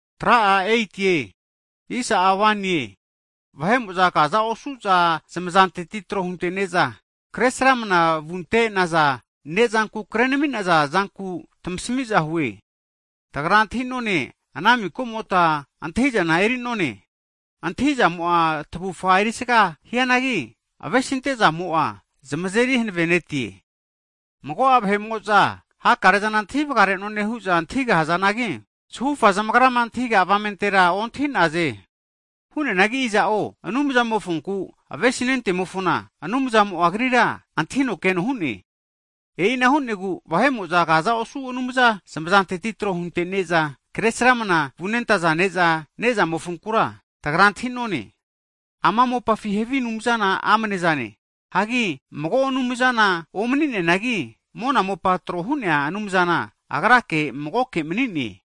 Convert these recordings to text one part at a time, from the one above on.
Hagi vahe'mo'za kaza osu'za havige anumza zamazanteti tro hunte'ne'za, kresramna vunte'naza ne'zanku krenami'naza zanku tamasami'za hue. Tagra antahi'none ana mikamota antahi'zana eri'none. Antahi'zamo'a tavufa erisaga hianagi, avesinte'zamo'a zamazeri hanavenetie. Mago'a vahe'mo'zama hakare'zana antahi vagare'none hu'za antahigahazanagi, zahufa zamagrama antahiga avamentera ontahi'naze. Hu'neanagi iza'o Anumzamofonku avesinentemofona, Anumzamo'a agrira antahino keno hu'ne. E'ina hu'negu vahe'mo'za kaza osu havi anumza zamazanteti tro hunte'ne'za, kresramna vunentaza ne'zama ne'zamofonkura, tagra antahi'none, ama mopafi havi anumzana amnezane. Hagi mago anumzana omani'neanagi, mona mopa tro hu'nea Anumzana, Agra magoke mani'ne.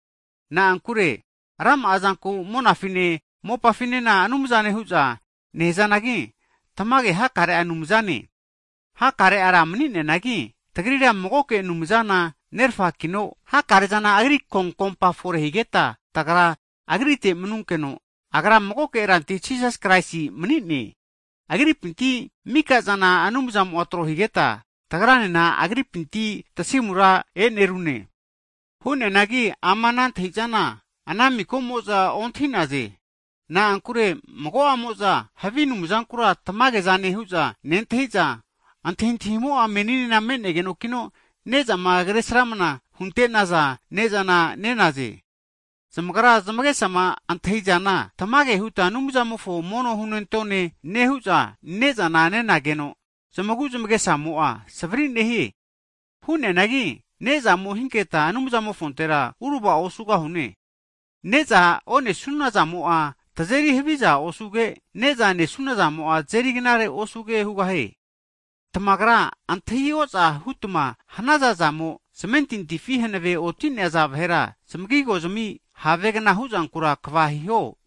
Na'ankure rama'a zanku monafine mopafinena anumzane hu'za nehazanagi, tamage hakare'a anumzane, hakare'a ra mani'nazanagi, tagrira magoke Anumzana Nerfakino hakare'zana Agri konkompa fore higeta, tagra Agrite manunkeno, Agra magoke Rantia Jisas Kraisi mani'ne. Agripinti mikazana Anumzamo'a tro higeta, tagranena Agripinti tasimura e'nerune. Hu'neanagi ama ana antahi'zana ana mika'mo'za ontahi'naze. Na'ankure mago'amo'za, havi anumzankura tamage'zane hu'za nentahi'za, antahintahimo'a meninena me'negenokino, ne'zama kresramna hunte'naza ne'zana nenaze. Zamagra zamagesama antahi'zana tamage huta Anumzamofo mono hunentone nehu'za, ne'zana nenageno zamagu zmagesamo'a savri nehie. Hu'neanagi ne'zamo hinketa Anumzamofontera uravao osugahune. Ne'za onesunazamo'a, tazeri haviza osuge, ne'za nesunazamo'a tazeri knare osuge hugahie. Tamagra antahi oza hutma hanaza zamo, zmentintifi hanave oti'naza vahera zmagigo zami havegna huzankura kva hiho.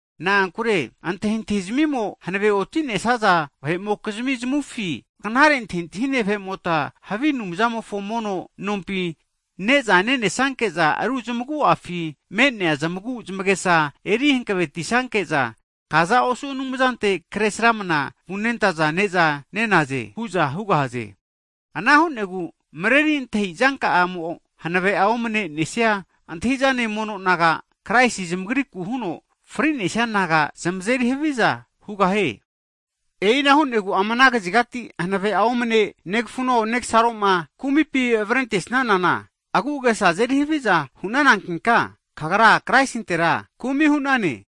Na'ankure antahintahi zmimo hanave oti'nesaza vahe'mokizmi zamufi knare antahintahine vahe'moka havi anumzamofo mono nompi ne'za nenesanke'za, ru zamagu'afi me'nea zamagu zamagesa eri hankavetisanke'za, kaza osu havige anumzante kresramana vu'naza ne'za nenaze hu'za hugahaze. Ana hu'negu mareri antahi'zanka'amo hanave'a omne'nesia antahi'zane mono naga, Kraisi zamagriku huno fri'nesia naga zamazeri haviza hugahie. E'ina higu ama ana kazigati hanave'a omne negafuno, negasaroma kumipi avrente'sanana, agu'agesa azeri haviza hu'nanankinka, kagra Kraisintera kumi hu'nane.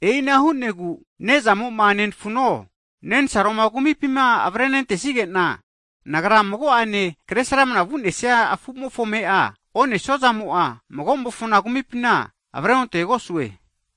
E'ina hu'negu, ne'zamo'ma nenefuno nensaroma kumipi avarenentesige'na, nagra mago'ane kresramna vu'nesia afu'mofo ame'a onesuazamo'a, mago'mofona kumipina avreontegosue.